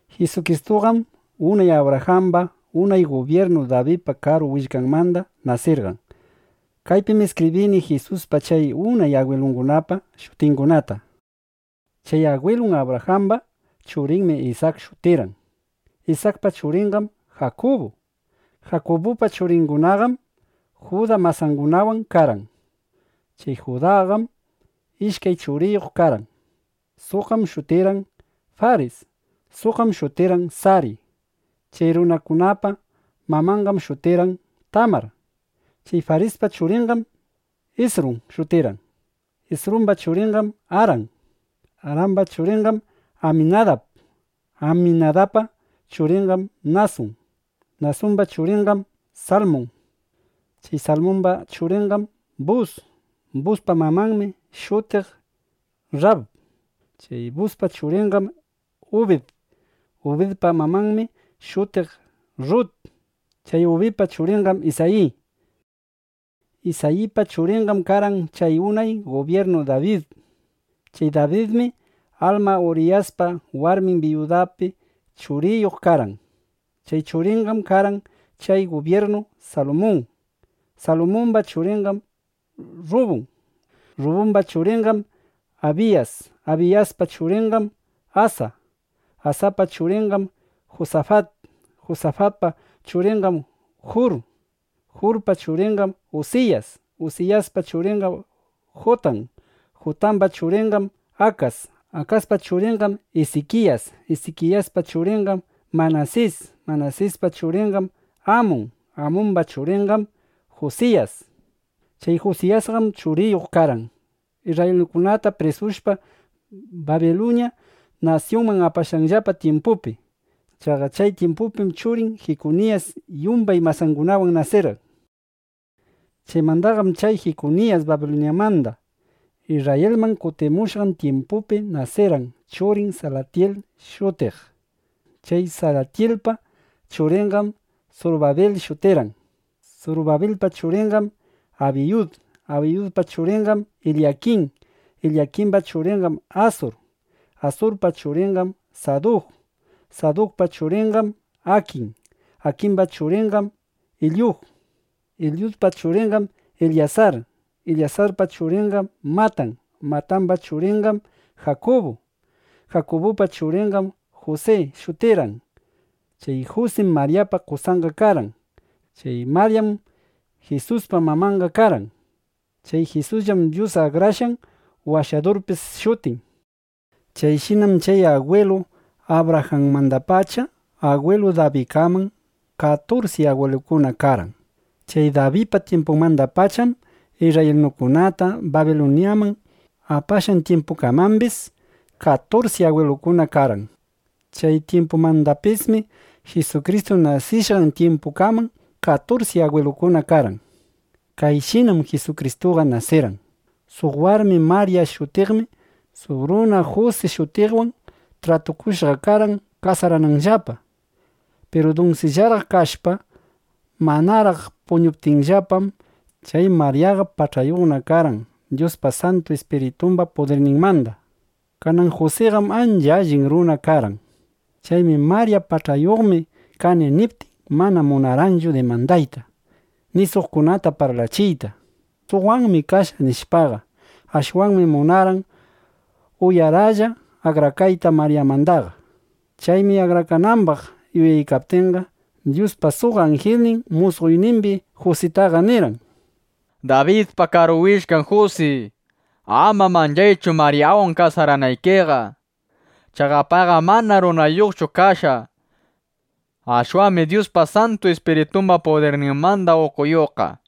Jisukristuqam unay Abrajamba, unay gubyirnu Dabidpa karu willkanmanda nasirqan. Kaypim iskibrini Jisuspa chay unay agwilungunapa shutingunata: Chay agwilun Abrajamba churinmi Isak shutirqan. Isakpa churinqam Jakubu. Jakubupa churingunaqam Juda masangunawan karqan. Chay Judaqam ishkay churiyuq karqan. Suqqam shutirqan Faris. Suqqam shutirqan Sari. Chay runakunapa mamanqam shutirqan Tamar. Chay Farispa churinqam Isrum shutirqan. Isrumba churinqam Aran; Aramba churinqam Aminadab; Aminadabpa churinqam Nasun; Nasumba churinqam Salmun; chay Salmumba churinqam Bus; Buspa mamanmi shutiq Rrab. Chay Buspa churinqam Ubid; Ubidpa mamanmi shutiq Rrut. Chay Ubidpa churinqam Isayi. Isayipa churinqam karqan chay unay gubyirnu Dabid. Chay Dabidmi alma Uriyaspa warmin biyudapi churiyuq karqan. Chay churinqam karqan chay gubyirnu Salumun. Salumumba churinqam Rrubun; Rrubumba churinqam Abiyas; Abiyaspa churinqam Asa; Asapa churinqam Jusafat; Jusafatpa churinqam Jur; Jurpa churinqam Usiyas; Usiyaspa churinqam Jutan; Jutamba churinqam Akas; Akaspa churinqam Isikiyas; Isikiyaspa churinqam Manasis; Manasispa churinqam Amun; Amumba churinqam Jusiyas. Chay Jusiyasqam churiyuq karqan isrraylinukunata prisushpa, Babiluña nasyunman apashqanllapa tyimpupi. Chaqa chay tyimpupim churin Jikuniyas yumbay masangunawan nasirqan. Chaymandaqam chay Jikuniyas Babiluñamanda Isrrayilman kutimushqan tyimpupi nasirqan churin Salatyil shutiq. Chay Salatyilpa churinqam Surubabil shutirqan. Surubabilpa churinqam Abiyud; Abiyudpa churinqam Ilyakin; Ilyakimba churinqam Asur; Asurpa churinqam Saduk; Sadukpa churinqam Akin; Akimba churinqam Ilyud; Ilyudpa churinqam Ilyasar; Ilyasarpa churinqam Matan; Matamba churinqam Jakubu. Jakubupa churinqam Jusi shutirqan. Chay Jusim Maryapa qosanqa karqan. Chay Maryam Jisuspa mamanqa karqan. Chay Jisusllam Dyus Akrashqan Washadurpis shutin. Chayshinam chay agwilu Abrajanmandapacha agwilu Dabidkaman katursi agwilukuna karqan. Chay Dabidpa tyimpunmandapacham isrraylinukunata Babiluñaman apashqan tyimpukamambis katursi agwilukuna karqan. Chay tyimpumandapismi Jisukristu nasishqan tyimpukaman katursi agwilukuna karqan. Kayshinam Jisukristuqa nasirqan. Suq warmi Marya shutiqmi suq runa Jusi shutiqwan tratukushqa karqan kasarananllapa. Piru dunsillaraq kashpa, manaraq puñuptinllapam, chay Maryaqa pach'ayuqna (ukuyuqna) karqan, Dyuspa Santu Ispiritumba pudirninmanda. Kanan Jusiqam ancha allin runa karqan. Chaymi Marya “Pach'ayuqmi (Ukuyuqmi) kani”, niptin, mana munarqanchu dimandayta, ni suqkunata parlachiyta: “Suqwanmi kashqa”, nishpaqa. Ashwanmi munarqan uyaraplla (uyaralla) akrakayta Maryamandaqa. Chaymi akrakanambaq yuyaykaptinqa, Dyuspa suq anjilnin musqoynimbi Jusitaqa nirqan: —Dabidpa karu willkan Jusi, ama manchaychu Maryawan kasaranaykiqa. Chaqa payqam mana runayuqchu kashqa. Ashwanmi Dyuspa Santu Ispiritumba pudirninmanda pach'ayuqqa (ukuyuqqa).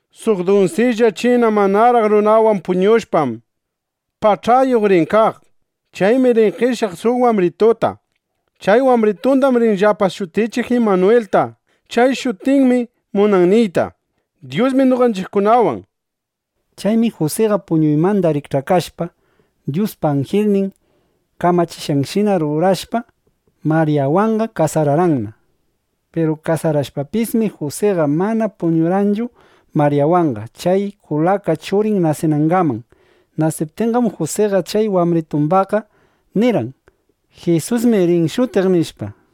Suq dunsilla china manaraq runawan puñushpam, pach'ayuq (ukuyuq) rin kaq. Chaymi rin qeshyaq suq wambrituta. Chay wambritundam rinllapa shutichiq Imanwilta. Chay shutinmi munan niyta: “Dyusmi noqanchiqkunawan”, nishpa. Chaymi Jusiqa puñuymanda rikch'akashpa, Dyuspa anjilnin kamachishqanshina rurashpa, Maryawanqa kasararqanna. Piru kasarashpapismi, Jusiqa mana puñurqanchu Maryawanqa, chay kulaka churin nasinangaman. Nasiptinqam Jusiqa chay wambritumbaqqa nirqan: “Jisusmi rin shutiq”, nishpa.